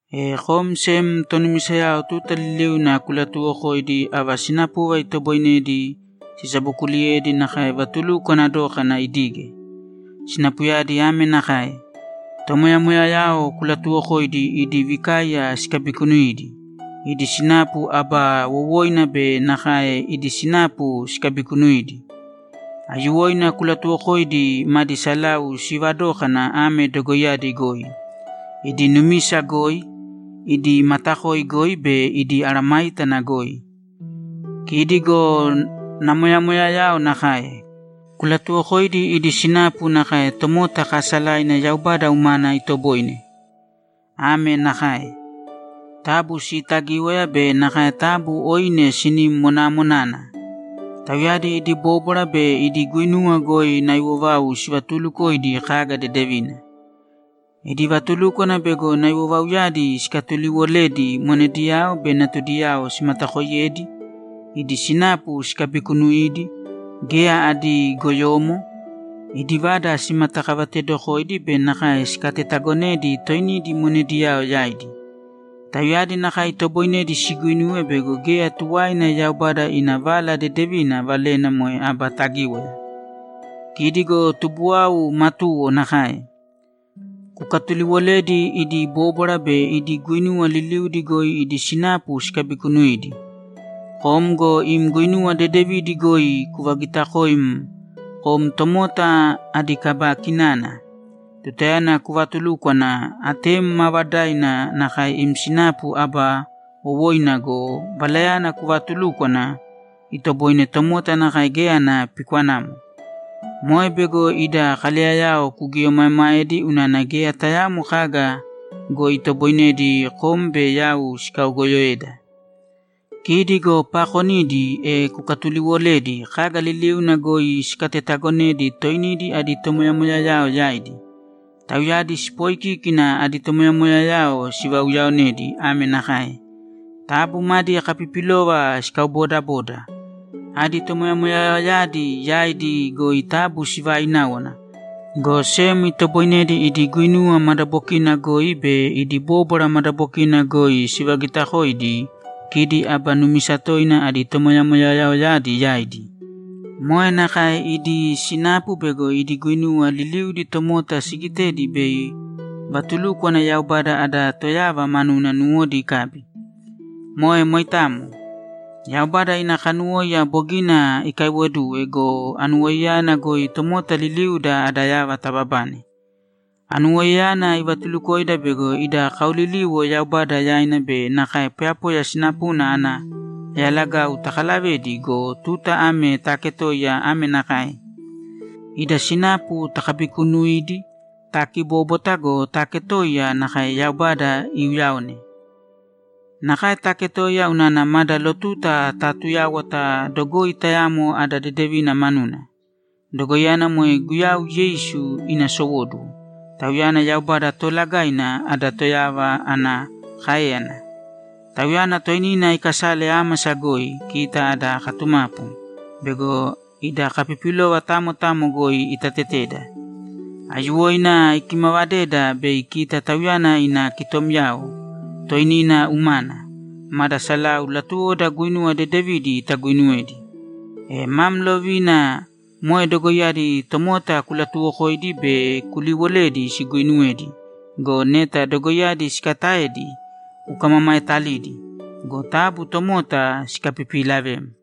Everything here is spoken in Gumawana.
E kom sem tonumisayao tuta liliuna kulatuuwokōidi ava sinapuva itoboinedi sisabokuliyedi nakae vatulukwana dókana idige. Sinapuyadi ame nakae: Tomoyamoyayao kulatuuwokōidi idi vikaiya sikabikunuidi, idi sinapu aba wowoina be nakae idi sinapu sikabikunuīdi. Aiyuwoina kulatuuwokōidi madi salau sivadókana ame dogoiyadi goi: Idi numisa goi, idi matakoi goi be idi mesayágana goi. Kidi go namoyamoyayao nakae. Kulatuuwokōidi idi sinapu nakae tomota kaasalaina Yaubada umana itoboine. Ame nakae: Taabu siitagīwaya be nakae taabu oine sinim monaamonāna. Tauyadi idi bóbwara be idi guinuwa goi naiwovau sivatuulukoidi kaga dedevina. Idi vatulúkwana bego naiwovauyadi sikatuliwoledi monediyao be natudiyao simatakooiyedi, idi sinapu sikabikunuidi, geya adi goyomo, idi vada simatakavatedokoidi be nakae sikatetagonedi toinidi monediyao yaidi. Tauyadi nakae itoboinedi siguinuwe bego geya tuwaina Yaubada ina Vala Dedevina valena moe aba tagíwaya. Kidi go tubuwau matuwo nakae. Kukatuliiwolēdi idi bóbwara be idi guinuwa liliudi goi idi sinapu sikabikunuidi. Kom go im guinuwa dedevidi goi kuvagiitakōim kom tomota adi kaba kinana. Tutayana kuvaatulúkwana, atem maavadaina nakae im sinapu aba wowoina go, valayana kuvaatulúkwana itoboine moitamo nakae geya ana pikwanamo. Moe bego ida kaleyayao kugieomaemaedi unana geya tayaamo kaga goi itoboinedi kom be yau sikaogoyoeda. Kidi go paakonidi, e kukatuliiwolēdi kaga liliuna goi sikatetagonedi toinidi adi tomoyamoyayao yaidi. Tauyadi sipoikíkina adi tomoyamoyayao sivauyaonedi ame nakae: Taabu madi kapipilova sikaubodabōda, adi tomoyamoyayaoyadi yaidi goi taabu sivaaināwana, go sem itoboinedi idi guinuwa madabokina goi be idi bóbwara madabokina goi sivagitakoidi kidi aba numisa toina adi tomoyamoyayaoyadi yaidi. Moe nakae idi sinapu bego idi guinuwa liliudi tomota sigitedi bei vatulúkwana Yaubada ada Toyava manuna nuwodi ikabi. Moe moitamo. Yaubada ina kanuwóiya bogina ikaiwoduwe go, anuwoiyayana goi tomota liliuda ada yava tababane. Anuwoiyayana ivatulukoida bego ida kaoliliwo Yaubada yaina be nakae poyapoya sinapuna ana yalagau takalavedi go, tuta ame taketoiya ame nakae: Ida sinapu takabikuunuidi, taakibóbwata go, taaketoiya nakae Yaubada iuyaone. Nakae taketōiya unana mada lotuta taatuyáwata dogoi tayamo ada dedevina manuna. Dogoiyana moe Guyau Yeisu ina sowóduwo; Tauyana Yaubada Toolagaina, ada Toyava, ana káeyana. Tauyana toinina ikasale ámasa goi, kita ada katumapu, bego ida kapipilova tamo tamo goi itateteda. Aiyuwoina ikimavadeda bei kita Tauyana ina kitomyao toinina umana, mada salau latuwoda guinuwa dedevidi taguinuwedi. E mam lovina moe dogoiyadi tomota kulatuwokōidi be kuliwolēdi siguinuwedi go, neta dogoiyadi sikataedi, kukamamaetalidi. Go taabu tomota sikapipiilavēm!